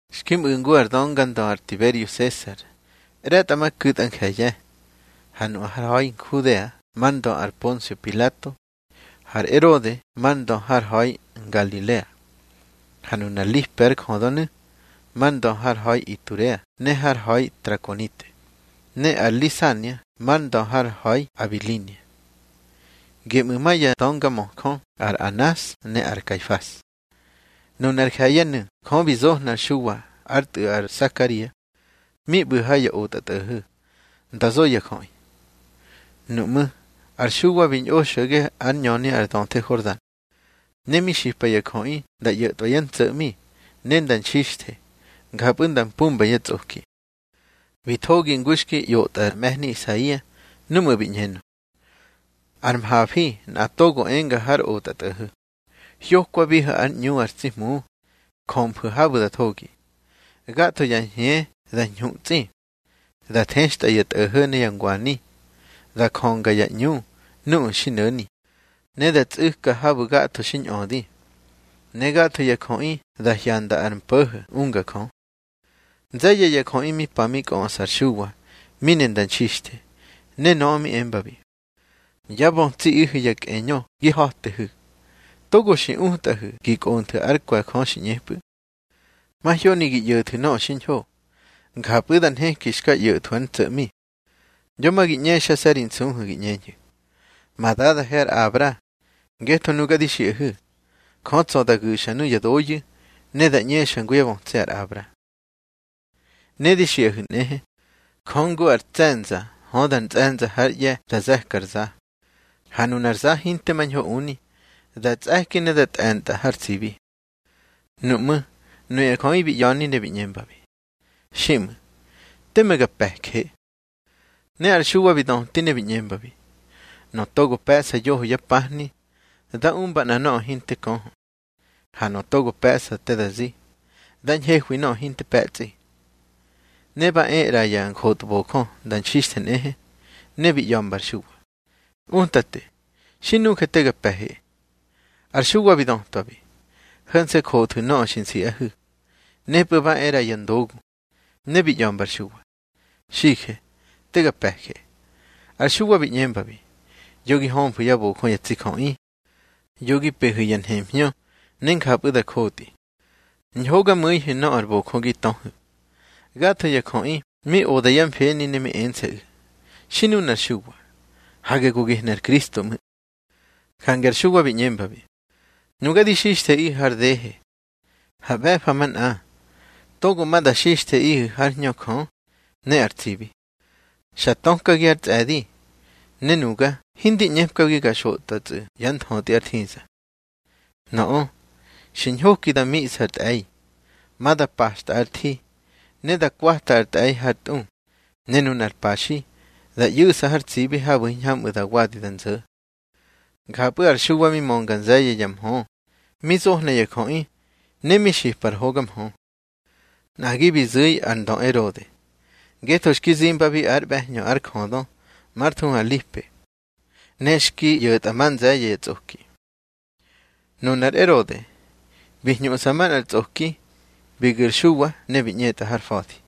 Xki mꞌu̱ ngu ar döngandö ar Tiberio Sesar ꞌre̱tꞌamaku̱tꞌa nje̱ye̱, ha nu har ha̱i Nhudea mar ndö ar Ponsio Pilato, har Erode mar ndö har ha̱i Ngalilea. Ha nunar Lipe ár jödönu̱, mar ndö har ha̱i Iturea ne har ha̱i Trakonite, ne ar Lisania mar ndö har ha̱i Abilinia. Geꞌmu̱ ma ya döngamöjö ar Anas ne ar Kaifas. Nunar je̱ye̱nu̱ Jö bi zohna ar Xuwa ár tꞌu̱ ar Sakaria, mi ꞌbu̱ ha ya otꞌatꞌo̱ho̱, nda zo ya jöꞌi. Nuꞌmú̱ ar Xuwa bi ñꞌo xo̱ge ár ñöni ar döthe Hordan. Ne mi xipa ya jöꞌi nda ꞌyo̱tꞌwa yá ntso̱ꞌmi, ne nda nxixthe, njapꞌu̱ nda mpumba yá tsꞌoki. Bi thogi ngu xki ꞌyotꞌa ar mꞌe̱hni Isaia núꞌmu̱ bi ꞌñenö: Ár mhafi nꞌa togo enga har otꞌatꞌo̱ho̱: Hyokwabihu̱ ár ꞌñu ar tsi Hmu, jömfu̱ habu̱ da thogi. Gatho ya hñe da ñhutsꞌi. Da thextꞌa ya tꞌo̱ho̱ ne ya ngwani, da jönga ya ꞌñu nuꞌu̱ xi no̱ni, ne da tsꞌu̱ka habu̱ gatho xi ñꞌödi. Ne gatho ya jöꞌi da hyanda ar mpo̱ho̱ unga Jö. Nze̱ye̱ ya jöꞌi mi pa mi kꞌöꞌsa ar Xuwa mi ne nda nxixthe, ne nöꞌö mi embabi: —Yá bötsiꞌihu̱ ya kꞌeñö gi ha̱tehu̱. Togo xi utꞌahu̱ gi kꞌonthu̱ ár kwe̱ Jö xi ꞌñepꞌu̱. Mahyoni gi ꞌyo̱thu̱ nöꞌö xiñho, njapꞌu̱ da nheki xka ꞌyo̱thwu̱ ár ntso̱ꞌmi. Yo ma gi ꞌñexase̱ ri nsuhu̱ gi ꞌñeñhu̱: Ma dadahe ar Abra. Ngetho nuga di xiꞌahu̱, Jö tsa̱ da gu̱xa nuya doyu̱, ne da ꞌñexa ngu yá bötsi ar Abra. Ne di xiꞌahu̱ nꞌehe, Jö ngu ar tse̱nza hödar ntsꞌe̱nza hár ꞌye̱ da ze̱ka ar za. Ha nunar za hinte mañho uni, da tsꞌe̱ki ne da tꞌe̱ntꞌa har tsibi. Nuꞌmú̱ nuya jöꞌi bi ꞌya̱ni ne bi ꞌñembabi: —Xiꞌmu̱, teme ga pe̱je. Ne ar Xuwa bi döti ne bi ꞌñembabi: —Nöꞌö togo pe̱ꞌsa yoho yá pahni, da umba nꞌa nöꞌö hinte köhö. Ha nöꞌö togo pe̱ꞌsa te da zi, da ñhehwi nöꞌö hinte pe̱tsꞌi. Ne ba e ꞌra ya njotbojö nda nxixthe nꞌehe, ne bi ꞌya̱mba ar Xuwa: —Utate, xi nuje, te ga pe̱he. Ar Xuwa bi dötwabi: —Ho̱nse̱ jothu̱ nöꞌö xi nsiꞌahu̱. Nepꞌu̱ ba e ꞌra ya ndogu, ne bi ꞌya̱mba ar Xuwa: —Xije, te ga pe̱je. Ar Xuwa bi ꞌñembabi: —Yo gi hömfu̱ yá bojö ya tsi jöꞌi. Yo gi pehu̱ ya nhemhñö ne njapꞌu̱ da jotꞌi. Ñhogamu̱ihu̱ nöꞌö ar bojö gi töhu̱. Gatho ya jöꞌi mi oda yá mfeni ne mi ense̱ꞌu̱: Xi nunar Xuwa, hage go gehnu̱ ar Kristo ꞌmu̱. Jange ar Xuwa bi ꞌñembabi: —Nuga di xixtheꞌihu̱ har dehe, ha ꞌbe̱fa manꞌa togo ma da xixtheꞌihu̱ hár Hñö Jö ne ar tsibi. Xa tökagi ár tsꞌe̱di, ne nuga hindi ꞌñepkagi ga xotꞌwatsꞌu̱ yá nthötꞌi ár thiza. Nöꞌö xi ñhoki da miꞌsa ar tꞌe̱i. Ma da paxtꞌa ár thi, ne da kwata ar tꞌe̱i hár tꞌu, ne nunar paxi da ꞌyu̱ꞌsa har tsibi habu̱ hiñhamꞌu̱ da wadi da nzo̱. Njapꞌu̱ ar Xuwa mi mönga nze̱ye̱ ya mhö mi zohna ya jöꞌi, ne mi xipa ar hoga mhö. Nꞌagi bi zu̱i ar ndö Erode, ngetho xki zimbabi ár ꞌbe̱hñö ár jödö már thuhu ar Lipe, ne xki ꞌyo̱tꞌa ma nze̱ye̱ ya tsꞌoki. Nunar Erode, bi hñuꞌsa manꞌar tsꞌoki, bi gu̱ ar Xuwa ne bi ꞌñetꞌa har fa̱di.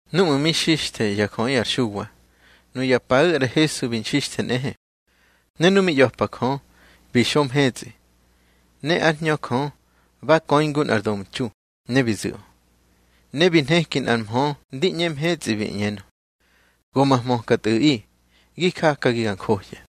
Núꞌmu̱ mi xixthe ya jöꞌi ar Xuwa, nuya paꞌu̱ ar Hesu bi nxixthe nꞌehe. Ne nu mi ꞌya̱pa Jö, bi xo mhetsꞌi, ne ár Hñö Jö ba köi ngu nꞌar domtxu, ne bi zu̱ꞌö. Ne bi nheki nꞌar mhö ndi ꞌñe mhetsꞌi, bi ꞌñenö: —Go ma hmöka Tꞌu̱ꞌi, gi jakagi ga njohya.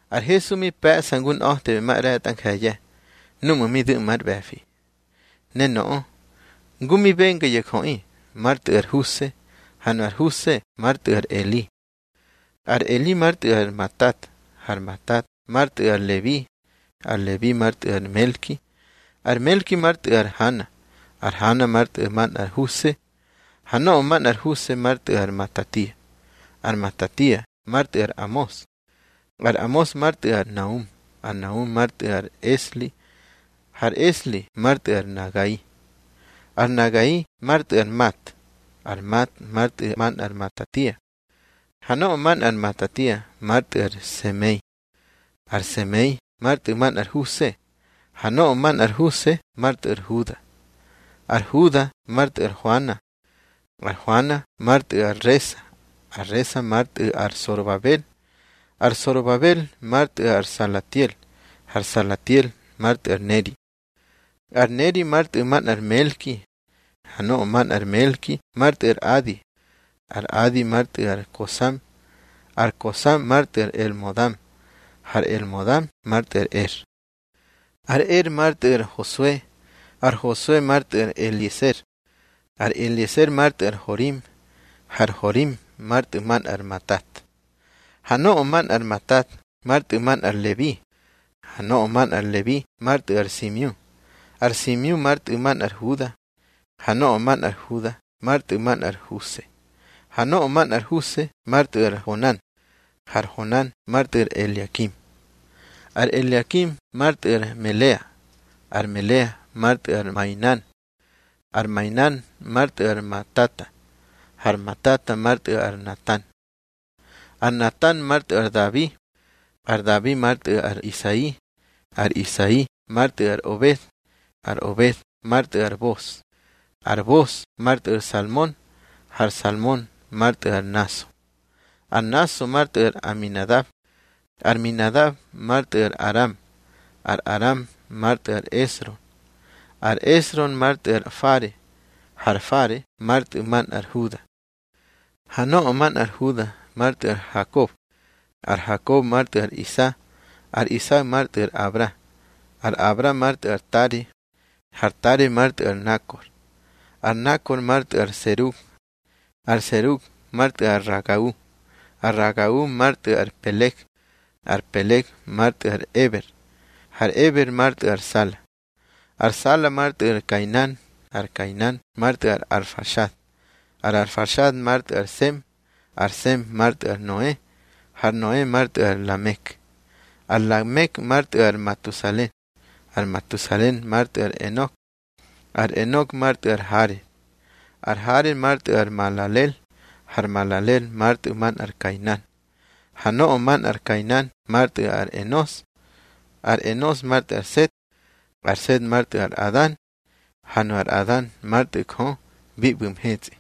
Ar Hesu mi pe̱ꞌsa ngu nꞌa̱temaꞌre̱tꞌa nje̱ye̱ núꞌmu̱ mi du̱ꞌma ár ꞌbe̱fi. Ne nöꞌö, ngu mi benga ya jöꞌi, már tꞌu̱ ar Huse, ha nu ar Huse már tꞌu̱ ar Eli. Ar Eli már tꞌu̱ ar Matat, har Matat már tꞌu̱ ar Lebi, ar Lebi már tꞌu̱ ar Melki, ar Melki már tꞌu̱ ar Hana, har Hana már tꞌu̱ manꞌar Huse. Ha nöꞌö manꞌar Huse már tꞌu̱ ar Matatia, ar Matatia már tꞌu̱ ar Amos, ar Amos már tꞌu̱ ar Naum, ar Naum már tꞌu̱ ar Esli, har Esli már tꞌu̱ ar Nagai. Ar Nagai már tꞌu̱ ar Mat, ar Mat már tꞌu̱ manꞌar Matatia, ha nöꞌö manꞌar Matatia már tꞌu̱ ar Semei, ar Semei már tꞌu̱ manꞌar Huse, ha nöꞌö manꞌar Huse már tꞌu̱ ar Huda. Ar Huda már tꞌu̱ ar Hoana, ar Hoana már tꞌu̱ ar Resa, ar Resa már tꞌu̱ ar Sorobabel, ar Sorobabel már tꞌu̱ ar Salatiel, har Salatiel már tꞌu̱ ar Neri. Ar Neri már tꞌu̱ manꞌar Melki, ha nöꞌö manꞌar Melki már tꞌu̱ ar Adi, ar Adi már tꞌu̱ ar Kosam, ar Kosam már tꞌu̱ ar Elmodam, har Elmodam már tꞌu̱ ar Er. Ar Er már tꞌu̱ ar Hosue, ar Hosue már tꞌu̱ ar Elieser, ar Elieser már tꞌu̱ ar Horim, har Horim már tꞌu̱ manꞌar Matat. Ha nöꞌö manꞌar Matat már tꞌu̱ manꞌar Lebi, ha nöꞌö manꞌar Lebi már tꞌu̱ ar Simiu, ar Simiu már tꞌu̱ manꞌar Huda, ha nöꞌö manꞌar Huda már tꞌu̱ manꞌar Huse, ha nöꞌö manꞌar Huse már tꞌu̱ ar Honan, har Honan már tꞌu̱ ar Eliakim. Ar Eliakim már tꞌu̱ ar Melea, ar Melea már tꞌu̱ ar Mainan, ar Mainan már tꞌu̱ ar Matata, har Matata már tꞌu̱ ar Natan. Ar Natan már tꞌu̱ ar Dabi, ar Dabi már tꞌu̱ ar Isai, ar Isai már tꞌu̱ ar Obed, ar Obed már tꞌu̱ ar Bos, ar Bos már tꞌu̱ ar Salmon, har Salmon már tꞌu̱ ar Naso. Ar Naso már tꞌu̱ ar Aminadab, ar Aminadab már tꞌu̱ ar Aram, ar Aram már tꞌu̱ ar Esrom, ar Esrom már tꞌu̱ ar Fare, har Fare már tꞌu̱ manꞌar Huda. Ha nöꞌö manꞌar Huda már tꞌu̱ ar Hakob, ar Hakob már tꞌu̱ ar Isa, ar Isa már tꞌu̱ ar Abra, ar Abra már tꞌu̱ ar Tare, har Tare már tꞌu̱ ar Nakor. Ar Nakor már tꞌu̱ ar Serug, ar Serug már tꞌu̱ ar Ragau, ar Ragau már tꞌu̱ ar Peleg, ar Peleg már tꞌu̱ ar Eber, har Eber már tꞌu̱ ar Sala. Ar Sala már tꞌu̱ ar Kainan, ar Kainan már tꞌu̱ ar Arfaxad, ar Arfaxad már tꞌu̱ ar Sem, ar Sem már tꞌu̱ ar Noe, har Noe már tꞌu̱ ar Lamek. Ar Lamek már tꞌu̱ ar Matusale, ar Matusale már tꞌu̱ ar Enok, ar Enok már tꞌu̱ ar Hared, ar Hared már tꞌu̱ ar Malalel, har Malalel már tꞌu̱ manꞌar Kainan. Ha nöꞌö manꞌar Kainan már tꞌu̱ ar Enos, ar Enos már tꞌu̱ ar Set, ar Set már tꞌu̱ ar Adan, ha nu ar Adan már tꞌu̱ Jö bi ꞌbu̱ mhetsꞌi.